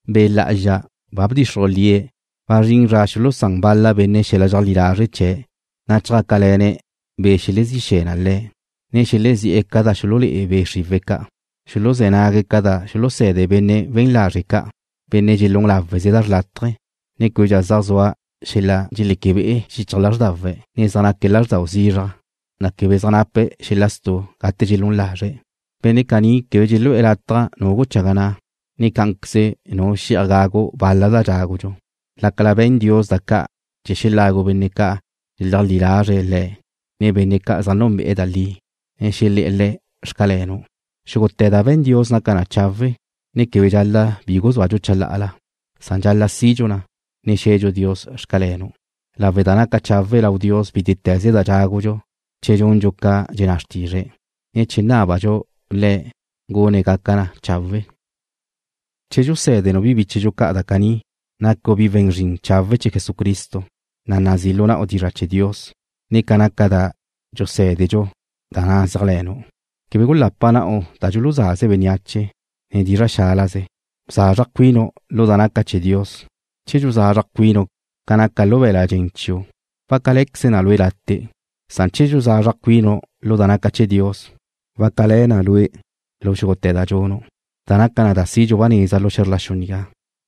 Be' Lá'azxa ba bdxixruj lie̱' wazrín zra xulusán bal-la benne' xel-la dxeajlí lazre' chee̱', na' chjácale̱ne̱' be' ca' xelezí xe̱ na le̱', ne xelezí'e̱ ca da xululé'e be' xriwe̱' ca'. Xuluzé̱ nague̱' ca da xuluse̱de benne' we̱n lazre' ca', benne' dxelún láweze da xrlátaje, ne québedxa zaj zua xel-la dxeléquebe'e xichaj lázrdawe̱', ne zaj naque̱' lázrdau zizraj, na' quebe zaj nape' xel-la stu' gate dxelún lazre̱'. Benne' caní quebe dxelu'e̱ latja nu guchaga na', ne cá'anqueze nu xe'aj gagu bal-la da dxágudxu, lácala be̱n Dios da ca' chee̱ xelagu benne' ca' dxeleajlí lazre̱' Le̱', ne benne' ca' zaj núnbe'e̱ da li, ne xelé̱'e̱ Le̱'; Xcalenu'. Xúgute̱ da be̱n Dios naca na chawe', ne quebe dxal-la' bi guzúadxu chalá'ala, san dxal-la' sidxu na, ne xe̱dxu Dios; Xcalenu', lawe' da naca chawe' lau Dios bítete̱ze da dxágudxu che dxundxu ca dxenná xrtizre̱', ne che nábadxu Le̱' gune̱' gaca na da chawe'. Che dxusé̱denu' bi bíchedxu ca' da caní, nacu' bi we̱n zrin chawe' chee̱ Jesucristo, na' nazí lu na'u dizra' chee̱ Dios, ne ca naca da dxusé̱dedxu, da na' zéajle̱nu'. Quebe gulapa na'u da dxuluzaze bénneache, ne dizra' xálaze. Bzazraj cuinu' lu da naca chee̱ Dios. Che dxuzazraj cuinu' ca naca lu be̱l-la' dxen chiu' wácale̱queze na lue' late', san che dxuzazraj cuinu' lu da naca chee̱ Dios, wácale̱ na lue' lu xúgute̱ da dxunu', na' naca na da sidxu ba neza lu xe̱zr la xu nigá,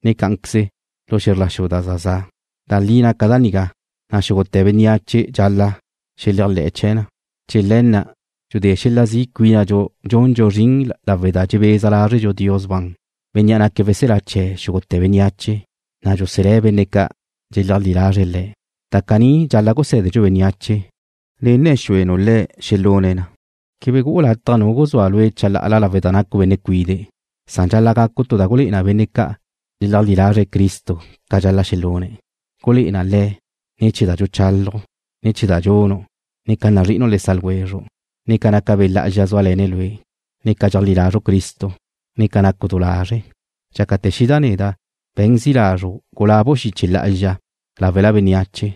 ne cá'anqueze lu xe̱zr la xu da za za'. Da li naca da nigá, na' xúgute̱ bénneache dxal-la' xeléajle̱'e̱ chee̱ na. Chee̱ le̱ na' dxudé xel-la zi' cuínadxu dxundxu zrin lawe' da dxebeza lázredxu Dios ban, Bénnea' naque̱' weselá chee̱ xúgute̱ bénneache, na' dxuselé̱' benne' ca' dxeajlí lazre̱' Le̱'. Da caní dxal-la' gusé̱denu' bénneache, ne nne̱ xuenu' le̱' xelune̱' na. Quebe gu'u lataj nu guzúa lue' chalá'ala lawe' da nacu' benne' cuide', san dxal-la' gacu' tu da gulé'e na benne' ca' dxeleajlí lazre̱' Cristo ca dxal-la' xelune̱'. Gulé'e na le̱': Ne̱ chee̱ da dxuchálaju', ne ne̱ chee̱ da dxunu', ne ca nazri'inu' le sa' ljwezru', ne ca naca Be' Lá'azxa zúale̱ne̱' lue', ne ca dxeajlí lazru' Cristo, ne ca nacu' du lazre'. Dxácate̱ xida' neda', be̱n zi' lazru' gulabu' xiche lá'azxa láwela bénneache,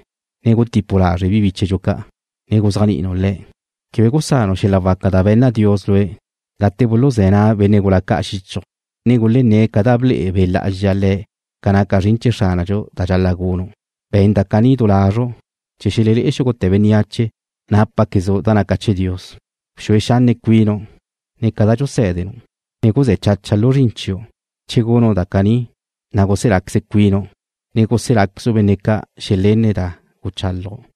ne gutipu' lazre' bi bíchedxu ca', ne guzéajni'inu' le̱'. Quebe gusanu' xel-la waca da be̱nna Dios lue' gate buluzé̱ na' benne' gula ca' xichju', ne gulenné̱' ca da ble'e Be' Lá'azxa le̱' ca naca zrin chee̱ Xránadxu da dxal-la' gunu'. Be̱n da caní du lazru' chee̱ xelelé'e xúgute̱ bénneache nápaquezu' da naca chee̱ Dios. Bxue xanne' cuinu', ne ca da dxusé̱denu', ne guzé̱ chacha lu zrin chiu'. Che gunu' da caní, na' guseláqueze cuinu', ne guseláquezu' benne' ca' xelenne̱' da guchálaju'.